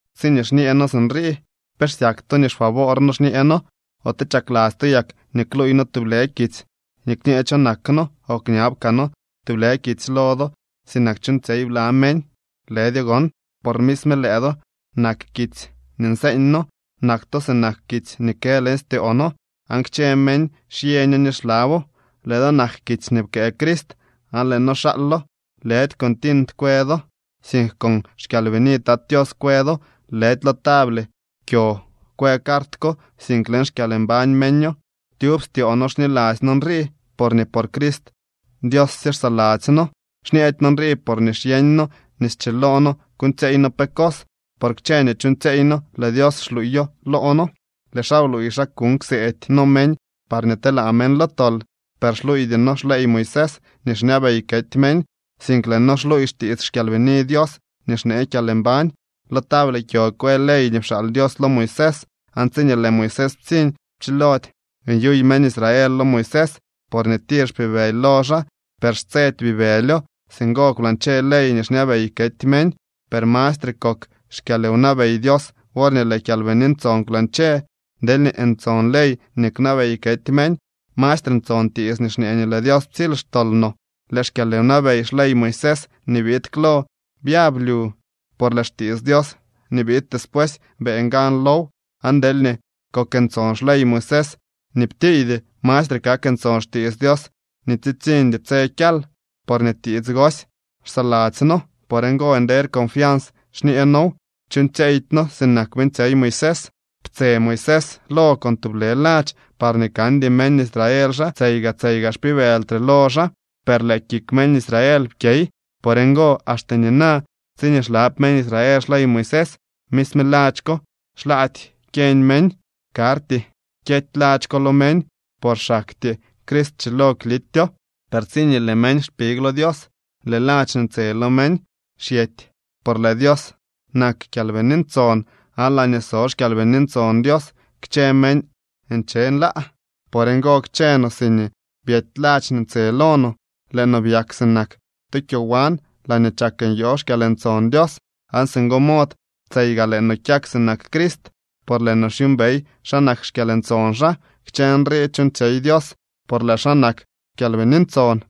Tsiñee xñee noo sinrii, ¿pe xsyak to nii xfavoor noo xñee noo? ¿Ote chakladzy to yak nii kluuy noo tublë kitsy nii kñee cho nak noo o kñab kaa noo tublë kitsy lo do, sinak chuuñtsyey bla meñ? Lëdyo gon, por misme lëë do nak kitsy nii nseeñ noo. Nak to sinak kitsy nii kë leñ styoo noo, aan kchë meñ xyeño ni xlabo. Lëë do nak kitsy nii pkëë Crist aan lëë noo xaalo. Lëdy con tint kwë do, sink con xKyalbini Tat Tios kwë do. Lëdy lo table kyo kwë cart ko, sink leñ xkyalmbañ meño. Tyub styoo noo xniladzy noo nrii, porñee por Crist Dios sye xsaladzy noo. Xñeedy noo nrii porñee xyeeñ noo nii schiloo noo kuuñtsyeey noo pe cos, por kchë nii chuuñtsyeey noo lëë Dios xluuyo loo noo. Lëë xaa bluuy xa kuuñ kseedy noo meñ parñee telaa meñ lo tol. Per xluuydy noo xley Moisés nii xñabey kety meñ, sink lëë noo xluuy xtiits xKyalbini Dios nii xnee kyalmbañ. Lo table kyo kwë ley nii pxaal Dios lo Moisés, aan tsiñee lëë Moisés ptsiñ, pchilody nyuy meñ Israel lo Moisés, porñee tir xpibëly lo xaa. Per xtsedy bibëlyo. Singo kwlañche ley nii xñabey kety meñ, per ¡mastre kok xkyalwnabey Dios worñee lëë Kyalbini Ntson kwlañche! Deelñee ntson ley nii kwnabey kety meñ, ¡mastre ntson tiits nii xñee nii lëë Dios ptsily xtol no! Lëë xkyalwnabey xley Moisés nii biid klo byab lyu, por lëë xtiits Dios nii biid despuesy beeñ gan low. Aan deelñee kok ntson xley Moisés nii ptiiydy, mastre kak ntson xtiits Dios nii tsitsiñdy tse kyal. Porñee tiits gosy xsaladzy noo. Por ngo nder confians xñee noow. Chuuñtsyeedy noo sinak beeñtsyey Moisés. Ptse Moisés lo con tublë ladx parñee kandy meñ Israel xa tseyga tseyga xpibëltre lo xaa. Per lëë kik meñ Israel pkyey. Por ngo, axte nina, tsiñee xlab meñ Israel xley Moisés, misme ladx ko xlaady kyeñ meñ. Karty kyety ladx ko lo meñ, por xaktyee Crist schilo klityo. Per tsiñee lëë meñ xpig lo Dios, lëë ladx nii ntse lo meñ xyety. Por lëë Dios nak Kyalbini Ntson, aan laañee so xKyalbini Ntson Dios, kchë meñ nche nlaa. Por ngo, kchë no siñee byety ladx nii ntse lo no, lëë no byak sinak tu kyowan laañee chak nyoo xkyalntson Dios. Aan singo mod tseyga lëë no kyak sinak Crist, por lëë no xyuumbey xa nak xkyalntson xaa. Kchë nrii chuuñtsyey Dios por lëë xaa nak Kyalbini Ntson.